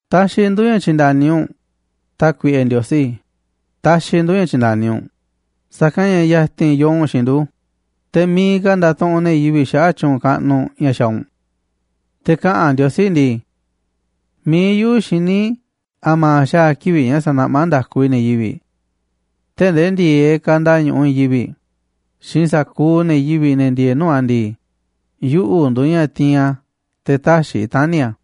Taxiꞌ ndu̱ ña̱ tyi̱nda̱ni u̱nꞌ, Tákuiꞌe Ndiosí, taxiꞌ ndu̱ ña̱ tyi̱nda̱ni u̱nꞌ, sa̱kanꞌ ña̱ ya̱ti̱n yoo u̱nꞌ xiinꞌ ndu̱, te̱ miiꞌ ka̱ ndatuꞌunꞌ ne̱ yivi̱ꞌ xaꞌa̱ꞌ tyu̱u̱n kaꞌnuꞌ ña̱ xaaꞌ u̱nꞌ. Te̱ kaꞌa̱n Ndiosí ndii: “Mi̱iꞌ yuꞌu̱ xiní a̱ma̱ xaa̱ kivi̱ꞌ ña̱ sa̱naꞌmá nda̱ku i̱ ne̱ yivi̱ꞌ. Tee̱ꞌ ndee ndi̱e̱eꞌ kanda ñu̱ꞌuꞌ i̱i̱n yivi̱ꞌ xiinꞌ sa̱kuuꞌ ne̱ yivi̱ꞌ, ne̱ ndieeꞌ nuu̱ꞌ a̱ ndii, yuꞌu̱ nduuꞌ ña̱ tiinꞌ a̱ te̱ tä̱xi̱ i̱ tani̱ a̱.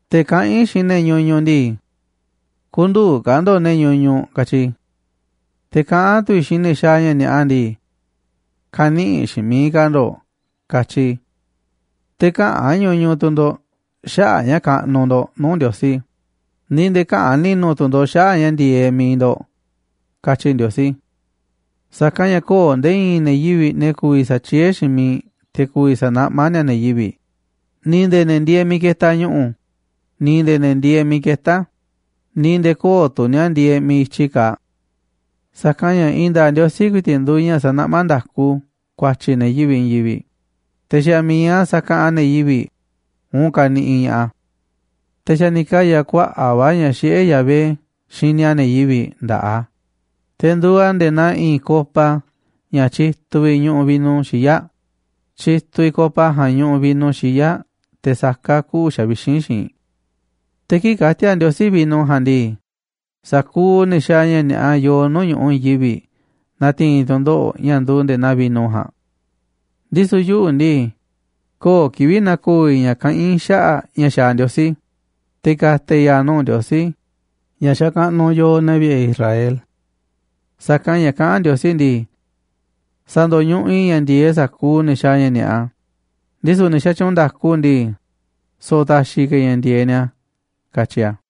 Te̱ kaꞌán i̱ xiinꞌ ne̱ ñuñuꞌ ndii: ‘Kü̱ndu̱u̱ ka̱ ndo̱ꞌ ne̱ ñuñuꞌ’, katyi i̱. Te̱ kaꞌán tu̱ i̱ xiinꞌ ne̱ xaaꞌ ña̱ ni̱a̱ꞌa ndii: ‘Kä̱ni̱ꞌi̱ xiinꞌ miiꞌ ka̱ ndo̱ꞌ’, katyi i̱. Te̱ käꞌa̱n ñuñuꞌ tu̱ ndo̱ꞌ xaꞌa̱ꞌ ña̱ kaꞌnuꞌ ndo̱ꞌ nuu̱ꞌ Ndiosí, ni̱ nde̱e̱ käꞌa̱n ni̱nu̱ tu̱ ndo̱ꞌ xaꞌa̱ꞌ ña̱ ndi̱e̱eꞌ mi̱iꞌ ndo̱ꞌ”, katyi Ndiosí. Sa̱kanꞌ ña̱ köo̱ꞌ nde̱e̱ i̱i̱n ne̱ yivi̱ꞌ, ne̱ ku̱vi̱ sa̱tyiee̱ xiinꞌ miiꞌ te̱ ku̱vi̱ sa̱naꞌmá ni̱a̱ ne̱ yivi̱ꞌ, ni̱ nde̱e̱ ne̱ ndieeꞌ miiꞌ ketaꞌ ñu̱ꞌu̱, ni̱ nde̱e̱ ne̱ ndieeꞌ miiꞌ ketá a̱, ni̱ nde̱e̱ köo̱ꞌ tu̱ ni̱a̱ ndieeꞌ miiꞌ i̱tyi kaaꞌ. Sa̱kanꞌ ña̱ i̱i̱n nda̱a̱ꞌ Ndiosí ku̱i̱ti̱ꞌ nduuꞌ ña̱ sanaꞌmá nda̱ku ku̱a̱tyi̱ ne̱ yivi̱ꞌ i̱i̱n yivi̱ꞌ, te̱ xa̱ mi̱iꞌ a̱ sakaꞌanꞌ ne̱ yivi̱ꞌ uun kaniꞌiꞌ ña̱ꞌaꞌ a̱. Te̱ xa̱ ni̱ kaya̱ kuaꞌa̱ꞌ va̱ ña̱ xiꞌé Yahvé xini a̱ ne̱ yivi̱ꞌ nda̱ꞌaꞌ a̱, te̱ nduuꞌ a̱ nde̱e̱ naa i̱i̱n copa ña̱ tyituꞌ vi̱ꞌ ñu̱ꞌu̱ vino xiyáꞌ, tyituꞌ copa ja̱a̱nꞌ ñuꞌuꞌ vino xiyáꞌ teꞌ saká kuꞌu̱ xavixínꞌ xiinꞌ. Te̱ kii̱ꞌ ka̱ti̱a̱ Ndiosí vino ja̱a̱nꞌ ndii, sa̱kuuꞌ ne̱ xaaꞌ ña̱ ni̱a̱ꞌa yoo nuu̱ꞌ ñu̱ꞌuꞌ i̱i̱n yivi̱ꞌ na̱ti̱i̱n tu̱ndoꞌo̱ꞌ ña̱ nduuꞌ nde̱e̱ naa vino ja̱a̱nꞌ. Ndisu̱ yuꞌu̱ ndii, köo̱ꞌ kivi̱ꞌ na̱ko̱o̱ i̱ ña̱ kaꞌán i̱ xaꞌa̱ꞌ ña̱ xaaꞌ Ndiosí, te̱ ka̱ta̱ i̱ ya̱a̱ nuu̱ꞌ Ndiosí ña̱ xakaꞌnuꞌ yooꞌ, ne̱ vi̱ꞌe̱ Israel. Sa̱kanꞌ ña̱ kaꞌán Ndiosí ndii: “Sa̱ndo̱ñuꞌuꞌ i̱ ña̱ ndi̱e̱eꞌ sa̱kuuꞌ ne̱ xaaꞌ ña̱ ni̱a̱ꞌa, ndisu̱ ne̱ xatyuunꞌ nda̱ku ndii, so̱ꞌo̱ ta̱xi̱ ka̱ i̱ ña̱ ndi̱e̱eꞌ ni̱a̱”, katyi a̱.